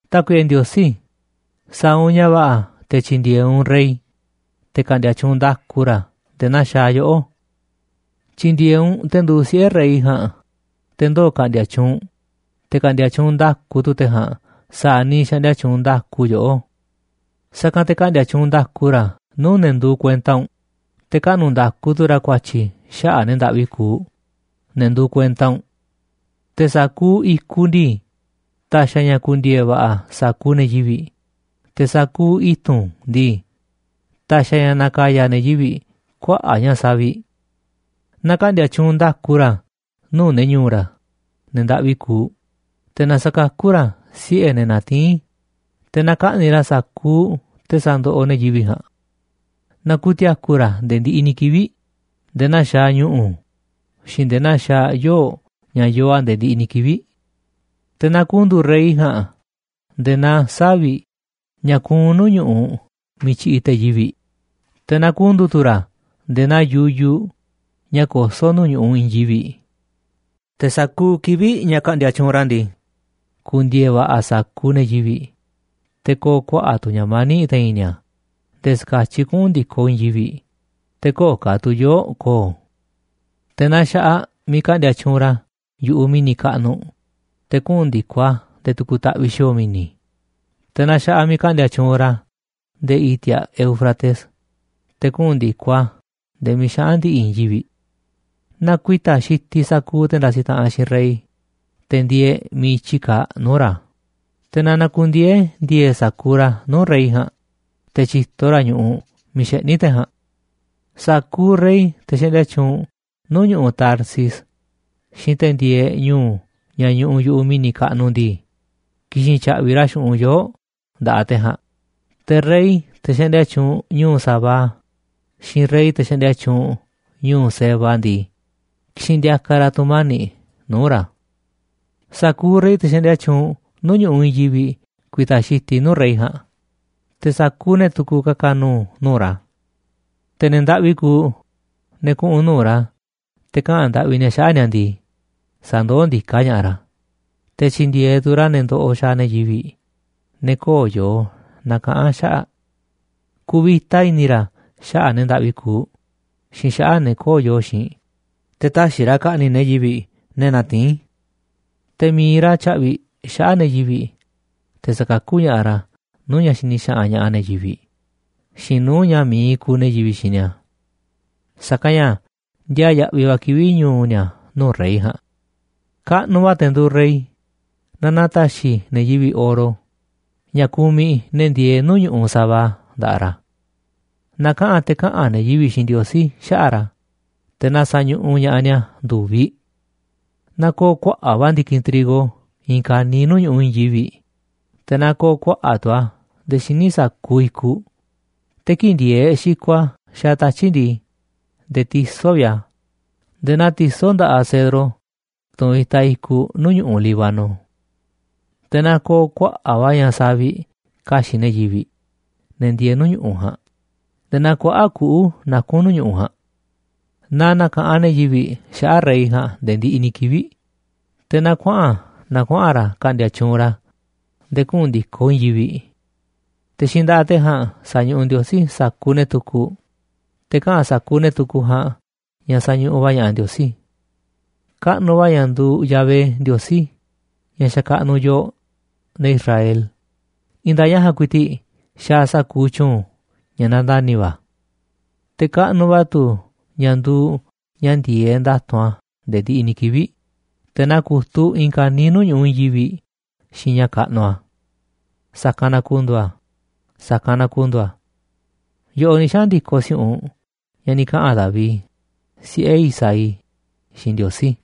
Tákuiꞌe Ndiosí, sa̱a̱ u̱nꞌ ña̱ va̱ꞌa̱ te̱ tyi̱ndi̱e̱eꞌ u̱nꞌ rey te̱ ka̱ꞌndi̱a̱ tyuunꞌ nda̱ku ra̱ nde̱e̱ naa xaaꞌ yoꞌó. Tyi̱ndi̱e̱eꞌ u̱nꞌ te̱ nduuꞌ siꞌe̱ rey ja̱a̱nꞌ, te̱ ndoo̱ ka̱ꞌndi̱a̱ tyuunꞌ, te̱ ka̱ꞌndi̱a̱ tyuunꞌ nda̱ku tu̱ te̱ ja̱a̱nꞌ sa̱a̱ niiꞌ xaꞌndia tyuunꞌ nda̱ku yoꞌó. Sa̱kanꞌ te̱ ka̱ꞌndi̱a̱ tyuunꞌ nda̱ku ra̱ nuu̱ꞌ ne̱ nduuꞌ kuenta u̱nꞌ, te̱ kaꞌnu̱ nda̱ku tu̱ ra̱ ku̱a̱tyi̱ xaꞌa̱ꞌ ne̱ ndaꞌvi kuuꞌ, ne̱ nduuꞌ kuenta u̱nꞌ. Te̱ sa̱kuuꞌ i̱kuꞌ ndii, ta̱xi̱ a̱ ña̱ ku̱ndi̱e̱e̱ va̱ꞌa̱ sa̱kuuꞌ ne̱ yivi̱ꞌ, te̱ sa̱kuuꞌ i̱tu̱n ndii, ta̱xi̱ a̱ na̱ka̱ya̱ ne̱ yivi̱ꞌ kuaꞌa̱ꞌ ña̱ saviꞌ. Na ka̱ꞌndi̱a̱ tyuunꞌ nda̱ku ra̱ nuu̱ꞌ ne̱ ñu̱u̱ ra̱, ne̱ ndaꞌvi kuuꞌ, te̱ na sa̱kakú ra̱ siꞌe̱ ne̱ natiín, te̱ na ka̱ꞌni̱ꞌ ra̱ sa̱kuuꞌ te̱ sandoꞌoꞌ ne̱ yivi̱ꞌ ja̱a̱nꞌ. Na ku̱ti̱a̱ku̱ ra̱ nde̱e̱ ndiꞌiꞌ ni̱ kivi̱ꞌ, nde̱e̱ naa xaaꞌ ñu̱ꞌu̱ xiinꞌ nde̱e̱ naa xaaꞌ yoo̱ꞌ ña̱ yoo a̱ nde̱e̱ ndiꞌiꞌ ni̱ kivi̱ꞌ. Te̱ na ku̱ndu̱u̱ rey ja̱a̱nꞌ nde̱e̱ naa savi̱ꞌ ña̱ kuunꞌ nuu̱ꞌ ñu̱ꞌuꞌ miiꞌ tyiꞌiꞌ te̱ yivi̱ꞌ, te̱ na ku̱ndu̱u̱ tu̱ ra̱ nde̱e̱ naa yuyuꞌ ña̱ kosó nuu̱ꞌ ñu̱ꞌuꞌ i̱i̱n yivi̱ꞌ. Te̱ sa̱kuuꞌ kivi̱ꞌ ña̱ ka̱ꞌndi̱a̱ tyuunꞌ ra̱ ndii, ku̱ndi̱e̱e̱ va̱ꞌa̱ sa̱kuuꞌ ne̱ yivi̱ꞌ, te̱ ko̱o̱ kuaꞌa̱ꞌ tu̱ ña̱ mani̱ꞌ te̱i̱n ni̱a̱ nde̱e̱ ska̱tyiꞌ kuꞌu̱n ndi̱koꞌ i̱i̱n yivi̱ꞌ, te̱ köo̱ꞌ ka̱ tu̱ yoo̱ꞌ ko̱o̱. Te̱ na xa̱ꞌaꞌ miiꞌ ka̱ꞌndi̱a̱ tyuunꞌ ra̱ yu̱ꞌuꞌ mi̱ni̱ kaꞌnuꞌ, te̱ kuꞌu̱n ndi̱koꞌ a̱ nde̱e̱ tu̱ku̱ taꞌviꞌ xi̱o̱o̱ mi̱ni̱, te̱ na xa̱ꞌaꞌ miiꞌ ka̱ꞌndi̱a̱ tyuunꞌ ra̱ nde̱e̱ i̱ti̱a̱ Éufrates, te̱ kuꞌu̱n ndi̱koꞌ a̱ nde̱e̱ miiꞌ xaꞌa̱n ndi̱ꞌi̱ i̱i̱n yivi̱ꞌ. Na ku̱i̱ta̱ xitiꞌ sa̱kuuꞌ te̱ ndasiꞌ taꞌanꞌ xiinꞌ rey, te̱ ndieeꞌ miiꞌ i̱tyi kaaꞌ, nuu̱ꞌ ra̱, te̱ na na̱ku̱ndiee̱ ndi̱e̱e̱ sa̱kuuꞌ ra̱ nuu̱ꞌ rey ja̱a̱nꞌ, te̱ tyi̱to ra̱ ñu̱ꞌuꞌ miiꞌ xeꞌní te̱ ja̱a̱nꞌ. Sa̱kuuꞌ rey, te̱ xaꞌndia tyuunꞌ nuu̱ꞌ ñu̱ꞌuꞌ Tarsis xiinꞌ te̱ ndieeꞌ ñu̱u̱ ña̱ ñuꞌuꞌ yu̱ꞌuꞌ mi̱ni̱ kaꞌnuꞌ ndii, ki̱xi̱n tya̱ꞌvi̱ ra̱ xu̱ꞌunꞌ yoo̱ꞌ nda̱ꞌaꞌ te̱ ja̱a̱nꞌ, te̱ rey, te̱ xaꞌndia tyuunꞌ ñu̱u̱ Sabá, xiinꞌ rey, te̱ xaꞌndia tyuunꞌ ñu̱u̱ Seba ndii, ki̱xi̱n ndi̱a̱ka̱ ra̱ tu̱mani̱ꞌ nuu̱ꞌ ra̱. Sa̱kuuꞌ rey, te̱ xaꞌndia tyuunꞌ nuu̱ꞌ ñu̱ꞌuꞌ i̱i̱n yivi̱ꞌ ku̱i̱ta̱ xitiꞌ nuu̱ꞌ rey ja̱a̱nꞌ, te̱ sa̱kuuꞌ ne̱ tukuꞌ ka̱ka̱ nu̱u̱ nuu̱ꞌ ra̱. Te̱ ne̱ ndaꞌvi kuuꞌ, ne̱ kuꞌu̱n nuu̱ꞌ ra̱ te̱ kaꞌa̱n ndaꞌvi ni̱a̱ xaꞌa̱ꞌ ni̱a̱ ndii, sa̱ndoó ndiká ña̱ꞌaꞌ ra̱, te̱ tyi̱ndi̱e̱eꞌ tu̱ ra̱ ne̱ ndoꞌoꞌ xaaꞌ ne̱ yivi̱ꞌ, ne̱ köo̱ꞌ yoo na̱kaꞌa̱n xaꞌa̱ꞌ. Ku̱vi̱ta i̱ni̱ ra̱ xaꞌa̱ꞌ ne̱ ndaꞌvi kuuꞌ xiinꞌ xaꞌa̱ꞌ ne̱ köo̱ꞌ yoo xiinꞌ, te̱ tä̱xi̱ ra̱ ka̱ꞌni̱ꞌ ne̱ yivi̱ꞌ ne̱ natiín. Te̱ mi̱iꞌ ra̱ tya̱ꞌvi̱ xaꞌa̱ꞌ ne̱ yivi̱ꞌ, te̱ sa̱kakú ña̱ꞌaꞌ ra̱ nuu̱ꞌ ña̱ xini xaꞌanꞌ ña̱ꞌaꞌ ne̱ yivi̱ꞌ xiinꞌ nuu̱ꞌ ña̱ mi̱iꞌ ku̱u̱ ne̱ yivi̱ꞌ xiinꞌ ni̱a̱. Sa̱kanꞌ ña̱ ndiaa yaꞌviꞌ va̱ kivi̱ꞌ ñu̱u̱ ni̱a̱ nuu̱ꞌ rey ja̱a̱nꞌ. Kaꞌnuꞌ va̱ te̱ nduuꞌ rey, na na̱ta̱xi̱ ne̱ yivi̱ꞌ oro, ña̱ kumiꞌ ne̱ ndieeꞌ nuu̱ꞌ ñu̱ꞌuꞌ Sabá, nda̱ꞌaꞌ ra̱. Na kaꞌa̱n te̱ kaꞌa̱n ne̱ yivi̱ꞌ xiinꞌ Ndiosí xaꞌa̱ꞌ ra̱, te̱ na sa̱ñuꞌuꞌ ña̱ꞌaꞌ ni̱a̱ ndu̱viꞌ. Na ko̱o̱ kuaꞌa̱ꞌ va̱ ndi̱kinꞌ trigo i̱i̱n ka̱niiꞌ nuu̱ꞌ ñu̱ꞌuꞌ i̱i̱n yivi̱ꞌ, te̱ na ko̱o̱ kuaꞌa̱ꞌ tu̱ a̱ nde̱e̱ xíniꞌ sa̱kuuꞌ i̱kuꞌ, te̱ kii̱ꞌ ndi̱e̱eꞌ xikoꞌ a̱ xaaꞌ tatyi̱ꞌ ndii, nde̱e̱ tisó vi̱ꞌ a̱, nde̱e̱ naa tisó nda̱ꞌaꞌ cedro, tunꞌ itaꞌ i̱kuꞌ nuu̱ꞌ ñu̱ꞌuꞌ Líbano. Te̱ na ko̱o̱ kuaꞌa̱ꞌ va̱ ña̱ savi̱ꞌ ka̱xi̱ꞌ ne̱ yivi̱ꞌ, ne̱ ndieeꞌ ñu̱ꞌu̱ ja̱a̱nꞌ, nde̱e̱ naa kuaꞌa̱ꞌ kuꞌu̱ nakún nuu̱ꞌ ñu̱ꞌuꞌ ja̱a̱nꞌ. Na na̱ka̱ꞌanꞌ ne̱ yivi̱ꞌ xaꞌa̱ꞌ rey ja̱a̱nꞌ nde̱e̱ ndiꞌiꞌ ni̱ kivi̱ꞌ, te̱ na kuaꞌa̱n na kuaꞌa̱n ra̱ ka̱ꞌndi̱a̱ tyuunꞌ ra̱ nde̱e̱ kuꞌu̱n ndi̱koꞌ i̱i̱n yivi̱ꞌ. Te̱ xiinꞌ nda̱ꞌaꞌ te̱ ja̱a̱nꞌ sa̱ñuꞌuꞌ Ndiosí sa̱kuuꞌ ne̱ tukuꞌ, te̱ kaꞌa̱n sa̱kuuꞌ ne̱ tukuꞌ ja̱a̱nꞌ ña̱ sañuꞌuꞌ va̱ ña̱ꞌaꞌ Ndiosí. Kaꞌnuꞌ va̱ ña̱ nduuꞌ Yahvé Ndiosí, ña̱ xakaꞌnuꞌ yooꞌ, ne̱ Israel, i̱i̱n nda̱a̱ꞌ ña̱ ja̱a̱nꞌ ku̱i̱ti̱ꞌ xaaꞌ sa̱kuuꞌ tyu̱u̱n ña̱ nandani̱ va̱. Te̱ kaꞌnuꞌ va̱ tu̱ ña̱ nduuꞌ ña̱ ndi̱e̱eꞌ nda̱tu̱nꞌ a̱ nde̱e̱ ndiꞌiꞌ ni̱ kivi̱ꞌ, te̱ na ku̱tuꞌ i̱i̱n ka̱niiꞌ nuu̱ꞌ ñu̱ꞌuꞌ i̱i̱n yivi̱ꞌ xiinꞌ ña̱ kaꞌnuꞌ a̱. Sa̱kanꞌ na ku̱ndu̱u̱ a̱. Sa̱kanꞌ na ku̱ndu̱u̱ a̱. Yoꞌoꞌ ni̱ xaꞌa̱n ndi̱koꞌ si̱u̱ꞌunꞌ ña̱ ni̱ kaꞌa̱n David, siꞌe̱ Isaí, xiinꞌ Ndiosí.